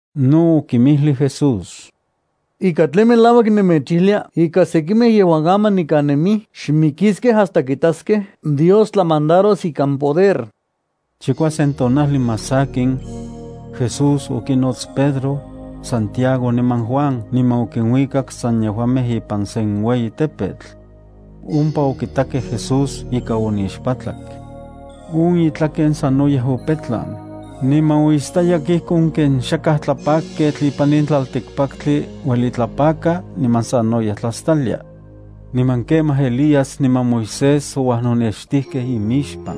No okinmijlij Jesús: —Ika tlen melauak nemechijlia ika sekimej yejuan aman nikan nemij xmijkiskej hasta kitaskej Dios tlamandaros ikan poder. Chikuasen tonajli más sakin, Jesús okinots Pedro, Santiago niman Juan niman okinuikak san yejuamej ipan sen ueyi tepetl. Ompa okitakej Jesús ika onixpatlak. On itlaken sanoyej opetlan, niman oistayak ijkon ken xakaj tlapakketl ipan in tlaltikpaktli ueli tlapaka, niman sanoyej tlastalia. Niman kemaj Elías niman Moisés ouajnonextijkej imixpan.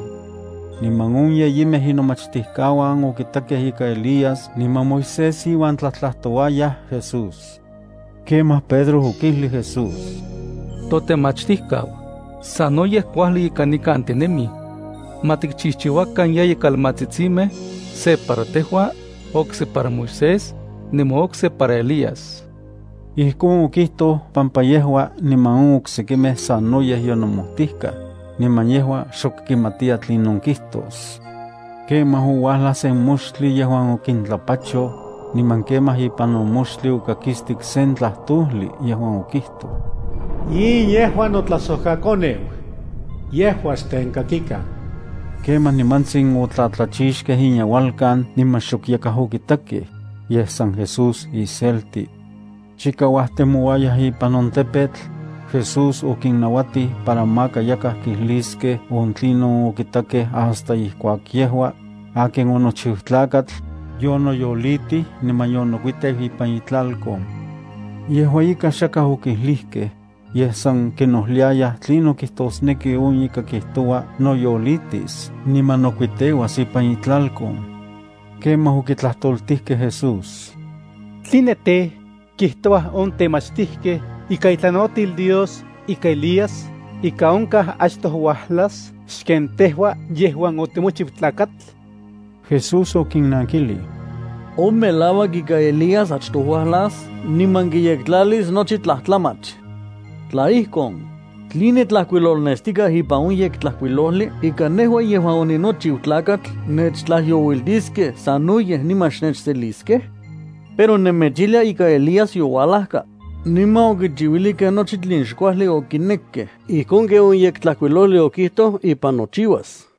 Niman on yeyimej inomachtijkauan okitakej ika Elías niman Moisés iuan tlajtlajtouayaj Jesús. Kemaj, Pedro okijlij Jesús: —Totemachtijkau, sanoyej kuajli ika nikan tinemij. Ma tikchijchiuakan yeyi kaltsitsimej, se para tejua, okse para Moisés, niman okse para Elías. Ijkon okijtoj pampa yejua niman on oksekimej sanoyej yonomojtijkaj, niman yejua xok kimatiya tlinon kijtos. Kemaj ouajlaj sen moxtli yejuan okintlapachoj, niman kemaj ipan on moxtli okakistik sen tlajtojli yejuan okijtoj: —In yejua notlajsojkaKoneu. Yejua xtenkakikan. Kemaj nimantsin otlatlachixkej inyeuelkan niman xok yakaj okitakej, yej san Jesús iselti. Chika uajtemouayaj ipan on tepetl, Jesús okinnauatij para maka yakaj kijliskej on tlinon okitakej hasta ijkuak yejua, akin onochiu Tlakatl, yonoyolitij niman yonokuiteu ipan itlalkon. Yejua ika xakaj okijlijkej, yej san kinojliayaj tlinon kijtosneki on ika kijtoua noyolitis niman nokuiteuas ipan itlalkon. Kemaj okitlajtoltijkej Jesús: —¿Tline tej, kijtouaj on temachtijkej ikan itlanauatil Dios ika Elías ika onkaj achtoj uajlas xken tejua yejuan otimochiu Tlakatl? Jesús okinnankilij: —On melauak ika Elías achtoj uajlas niman kiyektlalis nochi tlajtlamach. Tla ijkon, ¿tline tlajkuilolnestikaj ipan on Yektlajkuilojli ika nejua yejuan oninochiu Tlakatl nechtlajyouiltiskej sanoyej niman xnechseliskej? Pero nemechijlia ika Elías youajlajka, niman okichiuilijkej nochi tlen xkuajli okinekkej ijkon ken on Yektlajkuilojli okijtoj ipan nochiuas.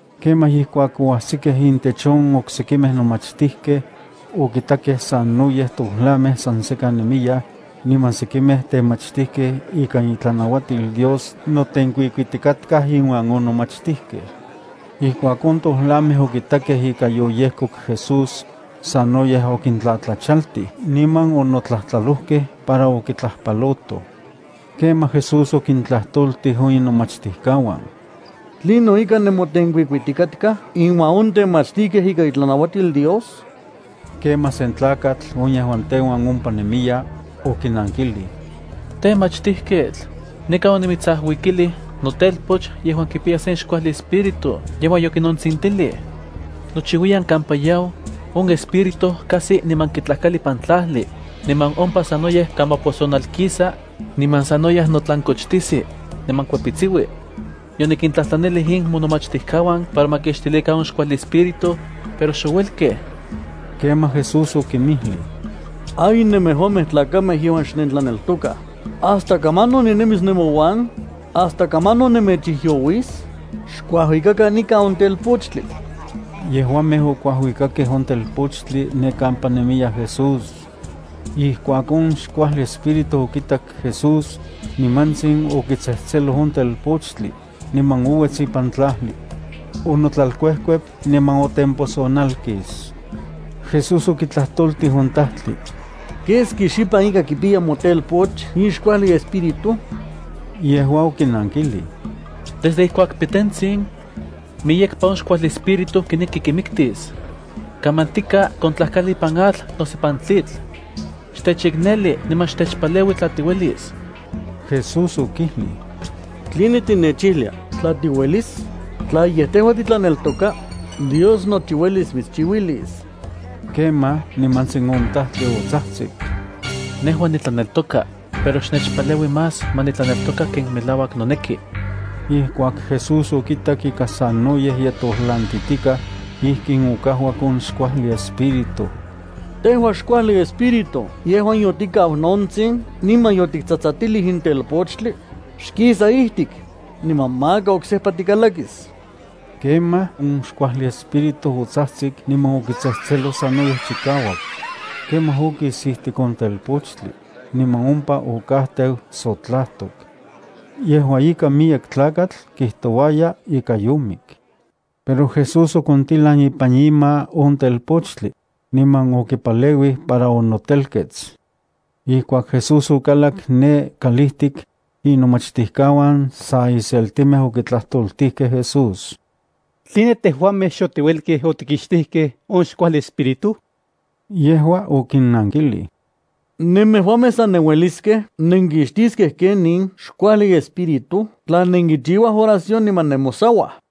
Kemaj ijkuak oajsikej intech on oksekimej nomachtijkej, okitakej sanoyej tojlamej san sekan nemiyaj, niman sekimej temachtijkej ikan itlanauatil Dios notenkuikuitikatkaj inuan on nomachtijkej. Ijkuak on tojlamej okitakej ika yoyejkok Jesús, sanoyej okintlajtlachaltij niman onotlajtlalojkej para okitlajpalotoj. Kemaj Jesús okintlajtoltij on inomachtijkauan: —¿Tlinon ika nenmotenkuikuitikatkaj inuan on temachtijkej ikan itlanauatil Dios? Kemaj sen tlakatl on yejuan teuan ompa nemiya, okinankilij: —Temachtijketl, nikan onimitsajuikilij notelpoch yejuan kipiya sen xkuajli espíritu yejuan yokinontsintilij. Nochiuiyan kampaka yau on espíritu kajsi niman kitlajkali ipan tlajli, niman ompa sanoyej kamaposonalkisa, niman sanoyej notlankochtijsi, niman kuepitsiui. Yonikintlajtlanilij in monomachtijkauan para ma kixtilikan on xkuajli espíritu, pero xouelkej. Kemaj Jesús okinmijlij: —¡Ay, nemejuamej tlakamej yejuan xnentlaneltokaj! ¿Hasta kamanon ninemis nemouan? ¿Hasta kamanon nemechijyouis? Xkuajuikakan nikan on telpochtli. Yejuamej okuajuikakej on telpochtli ne kampa nemiya Jesús. Ijkuak on xkuajli espíritu okitak Jesús, nimantsin okitsejtseloj on telpochtli, niman ouets ipan tlajli. Onotlalkuejkuep, niman otemposonalkis. Jesús okitlajtoltij on tajtli: —¿Keski xipan ika kipiya motelpoch in xkuajli espíritu? Yejua okinankilij: —Desde ijkuak pitentsin. Miyekpa on xkuajli espíritu kineki kimiktis. Kamantika kontlajkali ipan atl noso ipan tlitl. Xtechikneli niman xtechpaleui tla tiuelis. Jesús okijlij: —¿Tline tinechijlia: “Tla tiuelis”? Tla yej tejua titlaneltoka, Dios nochi uelis mitschiuilis. Kemaj, nimantsin on tajtli otsajtsik: —Nejua nitlaneltoka, pero xnechpaleui más ma nitlaneltoka ken melauak noneki. Ijkuak Jesús okitak ika sanoyej ye tojlantitikaj, ijkin okajuak on xkuajli espíritu: —Tejua xkuajli espíritu yejuan yotikau nontsin niman yotiktsatsatilij in telpochtli, xkisa ijtik, niman maka oksejpa tikalakis. Keman, on xkuajli espíritu otsajtsik niman okitsejtseloj sanoyej chikauak. Kemaj okis ijtik on telpochtli, niman ompa okajteu sotlajtok. Yejua ika miyek tlakatl kijtouaya ika yomik. Pero Jesús okontilan ipan ima on telpochtli, niman okipaleuij para onotelkets. Ijkuak Jesús okalak ne kalijtik, inomachtijkauan sa iseltimej okitlajtoltijkej Jesús: —¿Tline tejuamej xotiuelkej otikixtijkej on xkuajli espíritu? Yejua okinnankilij: —Nemejuamej san nenueliskej nenkixtiskej in ken in xkuajli espíritu tla nenkichiuaj oración niman nemosauaj.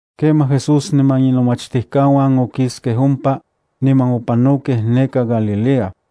Kemaj Jesús niman inomachtijkauan okiskej ompa, niman opanokej neka Galilea.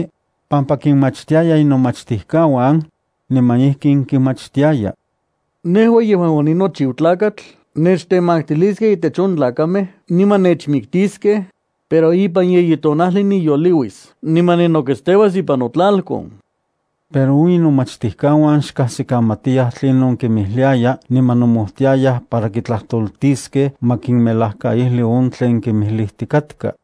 pampa kinmachtiaya inomachtijkauan, niman ijkin kinmachtiaya: —Nejua yejuan oninochiu Tlakatl nechtemaktiliskej intech on tlakamej niman nechmiktiskej, pero ipan yeyi tonajli niyoliuis niman ninoketsteuas ipan notlalkon. Pero on inomachtijkauan xkajsikamatiyaj tlinon kinmijliaya niman nomojtiayaj para kitlajtojliskej ma kinmelajkaijli on tlen kimijlijtikatka.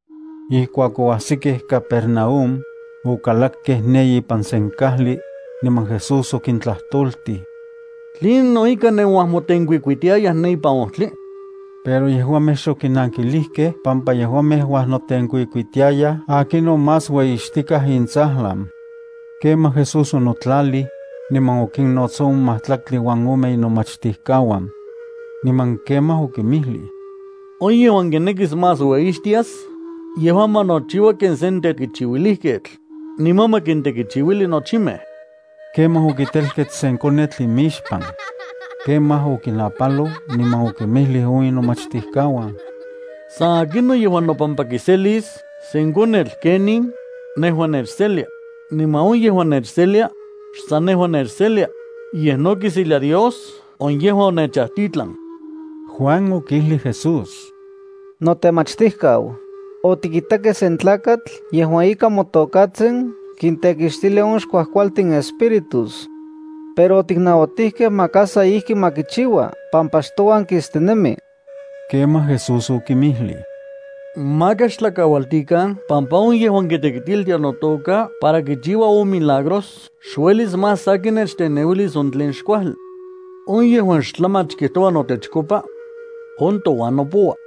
Ijkuak oajsikej Capernaúm, okalakkej ne ipan sen kajli, niman Jesús okintlajtoltij: —¿Tlinon ika nenuajmotenkuikuitiayaj ne ipan ojtli? Pero yejuamej xokinankilijkej pampa yejuamej uajnotenkuikuitiayaj akinon más ueyixtikaj intsajlan. Kemaj Jesús onotlalij, niman okinnots on majtlaktli uan ome inomachtijkauan. Niman kemaj okinmijlij: —On yejuan kinekis más ueyixtias, yejua ma nochiua ken sen tekichiuilijketl, niman ma kintekichiuili nochimej. Kemaj okitilan sen konetl niman okitelkets imixpan. Kemaj okinapaloj, niman okinmijlij on inomachtijkauan: —San akinon yejuan nopampa kiselis sen konetl ken in, nejua nechselia, niman on yejuan nechselia, xsan nejua nechselia, yej no kiselia Dios on yejuan onechajtitlan. Juan okijlij Jesús: —Notemachtijkau, otikitakej sen tlakatl yejuan ika motokatsin kintekixtilia on xkuajkualtin espíritus. Pero otiknauatijkej maka sa ijki ma kichiua pampa xtouan kistinemi. Kemaj Jesús okinmijlij: —Maka xtlakaualtikan pampa on yejuan kitekitiltia notoka para kichiua on milagros xuelis más sakin nechteneuilis on tlen xkuajli. On yejuan xtlamach kijtouaj totechkopa, on touan nopoua.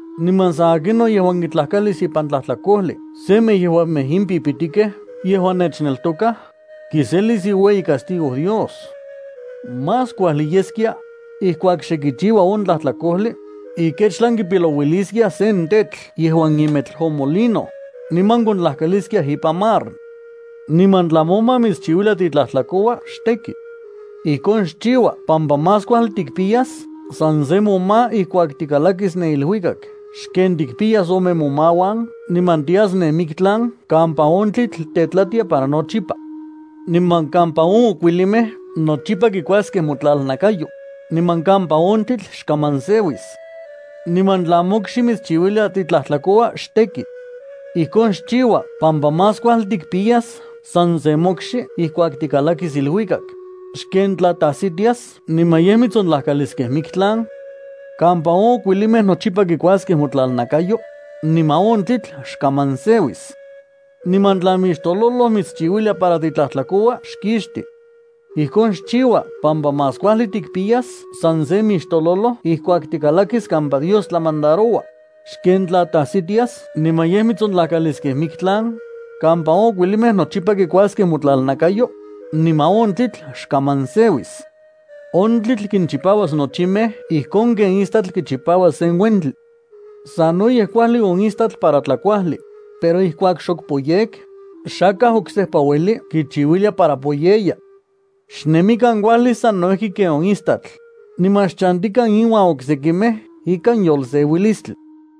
’Niman san akinon yejuan kitlajkalis ipan tlajtlakojli semej yejuamej in pipitikej yejuan nechneltokaj, kiselis iueyi castigo Dios. Más kuajli yeskia, ijkuak xe kichiua on tlajtlakojli, ikechtlan kipilouiliskiaj sen tetl yejuan imetl on molino, niman kontlajkaliskiaj ipan mar. Niman tla moma mitschiuilia titlajtlakoua, xteki. Ijkon xchiua pampa más kuajli tikpiyas san se moma ijkuak tikalakis ne iluikak xken tikimpiyas ome momauan niman tias ne miktlan kampa on tlitl tetlatia para nochipa, niman kampa on okuilimej nochipa kikuaskej motlalnakayo, niman kampa on tlitl xkaman seuis. Niman tla mokxi mitschiuilia titlajtlakoua, xteki. Ijkon xchiua pampa más kuajli tikpiyas san se mokxi ijkuak tikalakis iluikak, xken tla tajsitias niman yej mitsontlajkalis miktlan, kampa on okuilimej nochipa kikuaskej motlalnakayo, niman on tlitl xkaman seuis. Niman tla mixtololoj mitschiuilia para titlajtlakoua, xkixti. Ijkon xchiua pampa más kuajli tikpiyas san se mixtololoj ijkuak tikalakis kampa Dios tlamandaroua, xken tla tajsitias niman yej mitsontlajkalis miktlan, kampa on okuilimej nochipa kikuaskej motlalnakayo, niman on tlitl xkaman seuis. On tlitl kinchipauas nochimej ijkon ken istatl kichipaua sen uentli. ’Sanoyej kuajli on istatl para tlakuajli, pero ijkuak xok poyek, xakaj oksejpa ueli kichiuilia para poyeya. Xnemikan kuajli sano ijki ken on istatl, niman xchantikan inuan oksekimej ikan yolseuilistli.